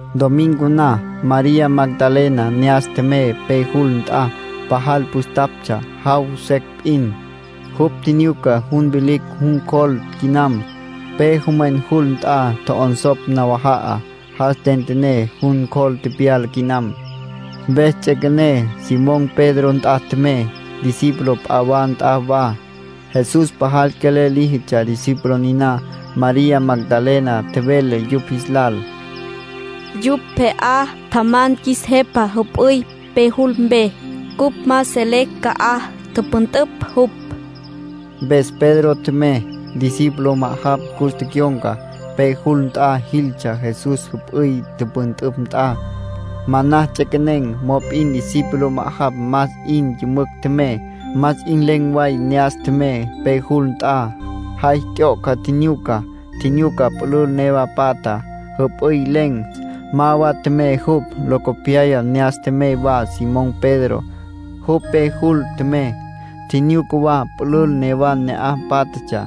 Domingo na, María Magdalena ne'as tjemey pe jul nt'a. Pajal püstaptsja, jaw secj p'in. Jupj tjinyuca jun vilicj jun cjol quinam. Pe jomwen jul nt'a tjo'onsopj nawaja'a, jas tentené, jun cjol tepyala quinam. Mpes ts'üequené, Simón Pedro nt'a tjemey, discípulo p'a wa nt'a wa. Jesús pajal quelel líjitsja discípulo niná. María Magdalena tjevele yupj jis lal: —Yupj pje'á tjaman qjuis Jepa jüp'üy pe jul mpe. Cupj ma selecj ca'aj tüpüntüpj jupj. Mpes Pedro tjemey. Discípulo ma'ajapj cus tecyon̈ca. Pe jul nt'a jiltsja Jesús jüp'üy tüpüntüpj nt'a. Manas ts'equenen̈, mop'in discípulo ma'ajapj más 'in yümücj tjemey, más 'in len̈ way ne'as tjemey pe jul nt'a. Jay t'yoca, tjinyuca. Tjinyuca pülül newa patja, jüp'üy len̈. Ma wama tjemey jupj. Locopyaya ne'as tjemey wa Simón Pedro. Jupj pe jul tjemey. Tjinyuca wa pülül newa ne'aj pátjatsja.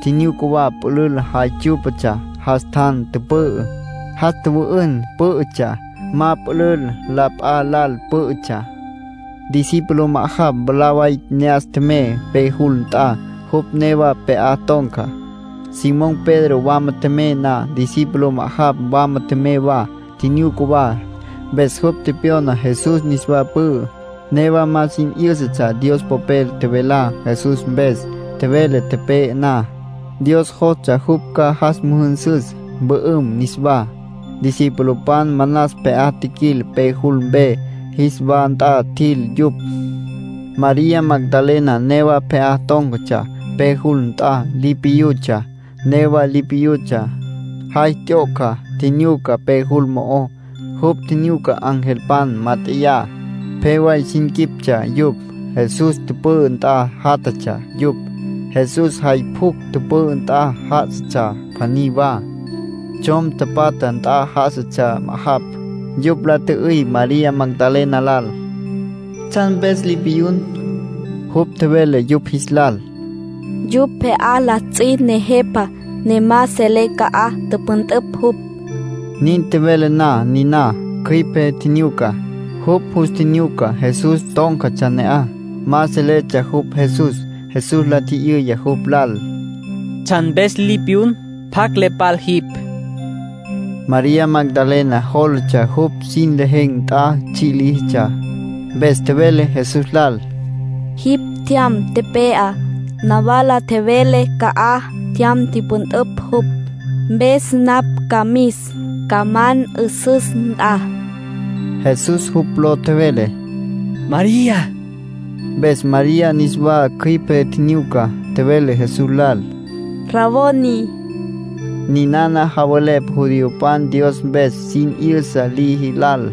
Tjinyuca wa pülül jay tsyú'patsja jas tjan tüpü'ü, jas tjüwü'ün pǘ'ütsja. Ma pülül la p'a lal pǘ'ütsja. Discípulo ma'ajapj mwalá way ne'as tjemey pe jul nt'a, jupj newa pje'á ton̈ca. Simón Pedro wama tjemey na, discípulo ma'ajapj wama tjemey wa. Tjinyuca wa, mpes jupj tepyona Jesús niswa pü'ü. Newa ma sin 'yǘsatsja Dios Popel tjevelá Jesús mpes. Tjevele tepe'e na, Dios jostsja jupj ca jas müjünsüs, mpü'üm niswá. Discipulopan manas pje'á tjiquil pe jul mpe, jis wa nt'a tjil yupj. María Magdalena newa pje'á tón̈catsja pe jul nt'a, li piyutsja. Newa li piyutsja, jay t'yoca, tjinyuca pe jul mo'ó. Jupj tjinyuca angelpan mat'eyá. Pje way sin quiptsja yupj. Jesús tüpü'ü nt'a játjatsja yupj. Jesús jay pjucj tüpü'ü nt'a já'asatsja pjaní wa. Tsjom tapatja nt'a já'asatsja ma'ajapj. Yupj la tjü'üy María Magdalena lal: —¿Tsjan mpes li piyun? Jupj tjevele yupj jis lal: —Yupj pje'á la ts'i Nejepa, ne ma selé ca'aj tüpüntüpj jupj. Nin tjevele na niná, cjüipe tjinyuca. Jupj jus tjinyuca Jesús tón̈catsja ne'aj. Ma seletsja jupj Jesús. Jesús la tji'yüya jupj lal: —¿Tsjan mpes li piyun? ¿Pjacj le pal jipj? María Magdalena jólatsja jupj sin lejen̈ nt'a tsji' líjitsja. Mpes tjevele Jesús lal: —Jipj tjyam tepe'á, nawala tjevele ca'aj tjyam tipyüntün jupj. Mpes napj ca mis, ca man 'üsüs nt'a. Jesús jupj ló tjevele. —María —tjevele jupj. Mpes María niswa cjüipe tjinyuca, tjevele Jesús lal: —Raboni. (Ninana javelepj judiopan Dios mpes sin 'yüsa liji lal.)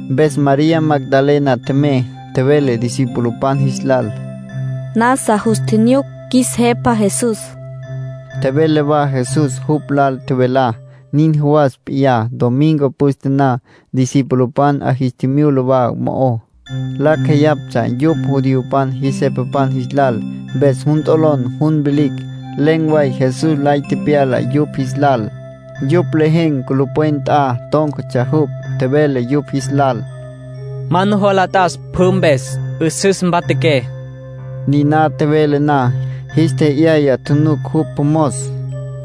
Mpes María Magdalena tjemey, tjevele discipulopan jis lal: “Nasa jus tjinyuc qjuis Jepa Jesús”. Tjevele wa Jesús jupj lal tjevelá. Nin jawas p'iyá, domingo püste na, discipulopan 'a jis tjimyula wa mo'ó. Lacj jeyaptsja yupj judiopan jis jepapan jis lal, mpes jun t'olon jun vilicj. Len̈ way Jesús lay tepyala yupj jis lal. Yupj lejen̈ culupwen nt'a tón̈catsja jupj. Tjevele yupj jis lal: —Ma nujola t'as pjü mpes. 'Üsüs mpatjaqué. Niná tjevele na, jis tje'yaya tjunuc jupj mos,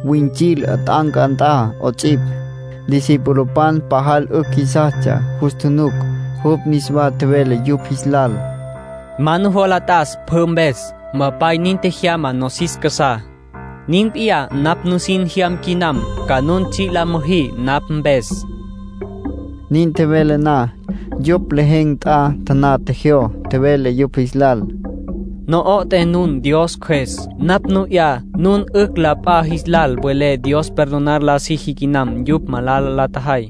wüints'il 'at'anca nt'a 'ots'ipj. Discipulopan pajal 'ücj jisastsja jus tjunuc. Jupj niswa tjevele yupj jis lal: —Ma nujola t'as pjü mpes. Mpapay nin tjejyama nosis casá. Nin p'iyá napj nusin jyam quinam, ca nun tsji' la müjí napj mpes. Nin tjevele na, yupj lejen̈ nt'a taná tjejyó. Tjevele yupj jis lal: —Na'ata nun Dios Cjües. Napj nu 'ya nun 'ücj la p'a jis lal welé Dios perdonar la siji quinam yupj malala la tjajay.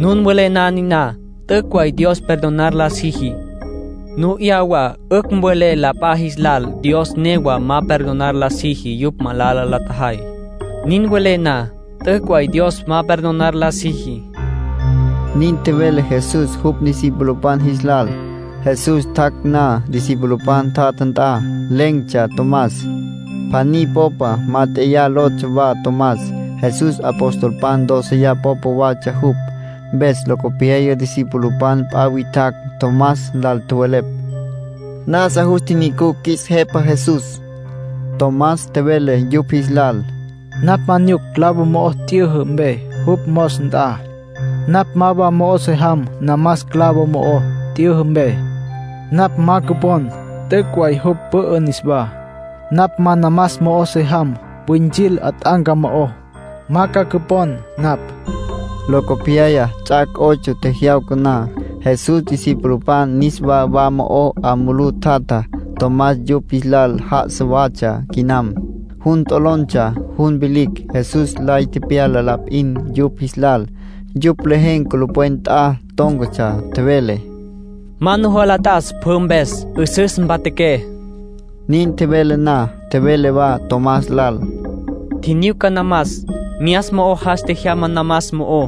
Nun welé na niná, t'üc' way Dios perdonar la siji. Nu 'ya wa 'ücj welé la p'a jis lal Dios newa ma perdonar la siji yupj malala la tjajay. Nin welé na, t'üc' way Dios ma perdonar la siji —nin tjevele Jesús jupj discipulopan jis lal. Jesús tjac' na discipulopan tjatja nt'a, len̈tsja Tomás. “Pjaní Popa Mat'eyá” lotsja wa Tomás. Jesús apostolpan dóceya popa watsja jupj. Mpes locopyaya discipulopan p'a witjacj Tomás lal tjowelepj: —Nasa jus tjinyucucj qjuis Jepa Jesús. Tomás tjevele yupj jis lal: —Napj ma nyuc clavo mo'o t'yüjü mpe jupj mos nt'a, napj ma mo'o se jam namas clavo mo'o t'yüjü mpe, napj ma ca cüpon t'üc' way jupj pü'ü niswá. Napj ma namas mo'o se jam wüints'il 'at'anca mo'ó, ma ca cüpon napj. Locopyaya, ts'ac' ocho tjejyawca na, Jesús discipulopan niswa wa mo'ó 'a mulú tjatja. Tomás yupj jis lal já'asa watsja quinam. Jun t'olontsja jun vilicj; Jesús lay tepyala la p'in yupj jis lal. Yupj lejen̈ culupwen nt'a tón̈catsja. Tjevele: —Ma nujola t'as pjü mpes. 'Üsüs mpatjaqué. Nin tjevele na, tjevele wa Tomás lal: —Tjinyuca namas. Myas mo'o jas tjejyama namas mo'ó,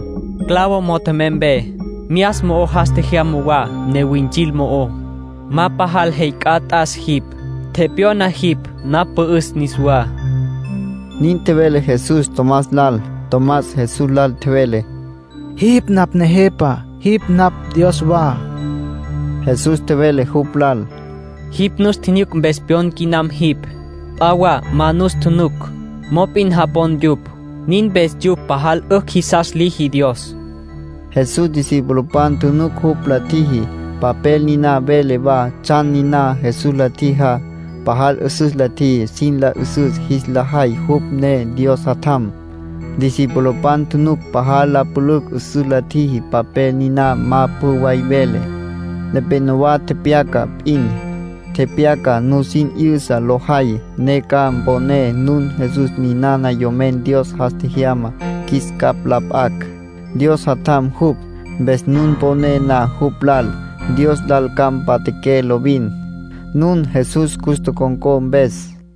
clavo mo'o tjemey mpe. Myas mo'o jas tjejyama wa newints'il mo'ó. Ma pajal jey c'a t'as jipj. Tepyona jipj napj pü'üs niswá —nin tjevele Jesús Tomás lal. Tomás Jesús lal tjevele: —Jipj napj Nejepa, jipj napj Dios wa. Jesús tjevele jupj lal: —Jipj nus tjinyuc mpes pyon quinam jipj. P'a wa ma nus tjunuc, mop'in japon yupj. Nin mpes yupj pajal 'ücj jisas liji Dios —nin tjevele Jesús. Jesús discipulopan tjunuc jupj la tjiji. Papel niná vele wa tsjan niná Jesús la tjijá. Pajal 'üsüs la tjiji sin la 'üsüs jis la jay jupj ne Dios Jatjam. Discipulopan tjunuc pajal la pülücj 'üsüs la tjiji papel niná ma pjü way vele. Nepénowa tepyaca p'in. Tepyaca nusin 'yüsa lo jay, ne ca mponé nun Jesús ninana Yomen Dios jas tjejyama qjuis capj la p'acj. Dios Jatjam jupj. Mpes nun poné na jupj lal, Dios lal ca mpatjaqué lovin, nun Jesús cus tocon̈có mpes.